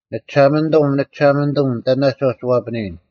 ᓂᒋᓴᒪᓂᑐᒻ, ᓂᒋᓴᒪᓂᑐᒻ, ᑕᓇᒡ ᐛᒋ ᐛᐱᓂᔨᓐ?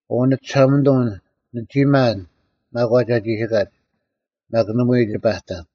ᐅ ᓂᒋᓴᒪᓂᑐᒻ, ᓂᒋ ᒪᓐ ᒪᒂᒡ ᐊ ᒋᓯᑲᒡ, ᒪᒃ ᓇᒪᐎᔾ ᒋ ᐸᑕᓐ;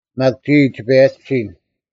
ᒪᒃ ᒋᔾ ᒋ ᐸᔭᒋᓯᓐ,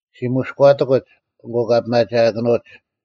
ᔅᒋ ᒧᔎᑎᑯᒡ, ᐊᑯ ᑲ ᐱᒪᒋᐊᑭᓄᐅᒡ: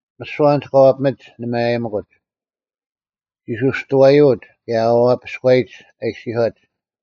ᒥᓯᐛ ᐊᓐᒡ ᑲ ᐛᐱᒥᒡ ᓂ ᒪᔭᔨᒥᑯᒡ: ᒋᓱᔅᑐᐛᔪᐅᒡ, ᑭᔭ ᐊ ᐛᐛᐱᔎᔨᒡ, ᐃᔅᒋᔄᐅᒡ,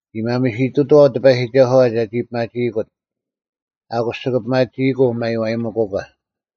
“ᒋ ᒪᒥᓯᑐᑕᐛᐤ ᑎᐸᔨᒋᒐᓱᐛ ᒐᒋ ᐱᒪᒋᐃᑯᑦ; ᐊᑯᔅ ᒋᑭ ᐱᒪᒋᐃᑯᐤ ᒪᔽᔨᒥᑯᒂ᙮”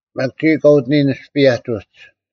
ᒪᒃ ᒋᔾ ᑲ ᐅᑎᓂᔨᓐ ᒥᔅᐸᔭᒡ ᐅᒡ: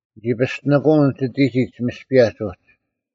ᓂᒋ ᐱᔅᑎᓂᑯᐅᓐ ᒋᑎᒋᒡ ᒥᔅᐸᔭᒡ ᐅᒋ: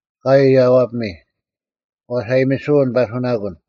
ᐊᑲᐎᔾ ᔭᐛᐱᒥ; ᐛᔅ ᐊᔨᒥᓯᐅᓐ ᐸᓱᓇᑯᓐ;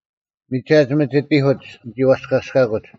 ᒥᒐᑦ ᒥᒋᑎᐧᑯᒡ ᓂᒋ ᐛᔅᑲᔅᑲᑯᒡ: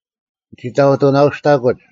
ᓂᒋ ᑕᐅᑐᓇᔨᔅᑕᑯᒡ,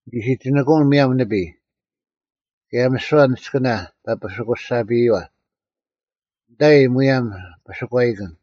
ᓂ ᓯᒋᓂᑯᐅᓐ ᒧᔭᒻ ᓂᐱᔾ, ᑭᔭ ᒥᓯᐛ ᓂᔅᑭᓇ ᐸᐱᓯᑯᔅᒐᐱᔪᐛ, ᓂᑕᐃ ᒧᔭᒻ ᐱᓴᒂᐃᑭᓐ;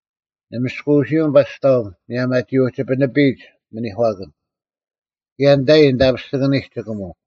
ᓂ ᒥᔅᑯᐅᓯᐅᓐ ᐸᔅᑕᐤ ᒧᔭᒻ ᐊᒋ ᐅᒋ ᐱᓂᐱᔨᒡ ᒥᓂᒂᑭᓐ, ᑭᔭ ᓂᑕᔨᔾ ᓂᑕᐱᔅᒋᑭᓂᒡ ᒋᑭᒧᐤ;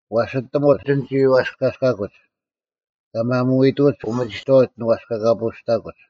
ᐛᔅ ᐊᑎᒧᒡ ᓂᒋ ᐛᔅᑲᔅᑲᑯᒡ; ᑲ ᒪᒧᐎᔨᑐᒡ ᐅᒥᒋᑥᐅᒡ ᓂ ᐛᔅᑲᑲᐳᐅᔅᑕᑯᒡ: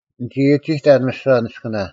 ᓂᒋ ᐊᒋᑕᓐ ᒥᓯᐛ ᓂᔅᑭᓇ: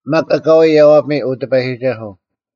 ᒪᒃ ᐊᑲᐎᔾ ᔭᐛᐱᒥ, ᐅ ᑎᐸᔨᒋᒐᓱᐤ: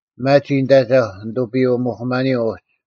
ᐱᒪᒋ ᓂᑦ ᐊᒐᐧᒄ ᓂᑐᐱᔪᐅ-ᒧᐧᑯᒪᓂᔪᐤ ᐅᒋ: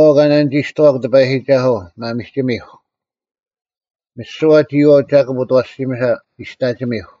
ᒋᔨᐛᐤ ᑲ ᓇᓂᒋᔅᑐᐛᒄ ᑎᐸᔨᒋᒐᓱᐤ, ᒪᒥᒋᒥᐧᒄ; ᒥᓯᐛ ᒋᔨᐛᐤ ᒐᑭᑉ ᐅᑦ ᐊᐛᓯᒥᓴ, ᒋᔅᑕᒋᒥᐧᒄ;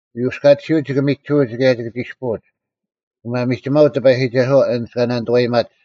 ᐅᔪᔅᑲᑎᓯᐅᒡ ᒋᑭ ᒥᒋᓱᐅᒡ ᑭᔭ ᒋᑭ ᒋᔅᐳᐅᒡ: ᒋᑭ ᒪᒥᒋᒪᐅᒡ ᑎᐸᔨᒋᒐᓱᐛ ᐊᓐᒡ ᑲ ᓇᓂᑐᐛᔨᒪᒡ: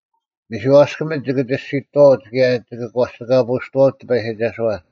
ᒥᓯᐛᔅᑭᒥᒡ ᒋᑭ ᒋᔅᒋᑐᐛᐅᒡ ᑭᔭ ᒋᑭ ᒂᔅᒋᑲᐳᐅᔅᑐᐛᐅᒡ ᑎᐸᔨᒋᒐᓱᐛ: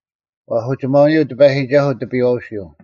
ᐛᔅ ᐅᒋᒪᐅᓂᔪᐤ ᑎᐸᔨᒋᒐᓱᐤ ᑎᐱᔨᐛᐅᓯᐤ: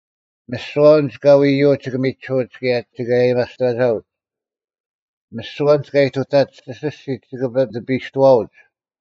ᒥᓯᐛ ᐊᓐᒡ ᑲ ᐎᔨᔪᐅᒡ ᒋᑭ ᒥᒋᓱᐅᒡ ᑭᔭ ᒋᑭ ᐊᔭᒥᐊᔅᑕᒐᐅᒡ: ᒥᓯᐛ ᐊᓐᒡ ᑲ ᐃᑐᑕᒡ ᐊᓯᔅᒋᒡ ᒋᑭ ᐱᑕᐱᔅᑐᐛᐅᒡ,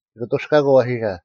ᒋᑭ ᐊᑐᔅᑲᑯᐤ ᐊᐛᓴ;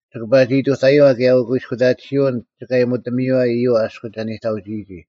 ᒋᑭ ᐸᒋ ᐃᑐᑕᔪᐛ, ᑭᔭ ᐅᑯᐃᔅᑯᑕᑎᓯᐅᓐ ᒋᑭ ᐊᔨᒧᑎᒧᐛᔪᐛ ᐃᔪᐛ ᐊᔎ ᒐ ᓂᑕᐅᒋᔨᒋ,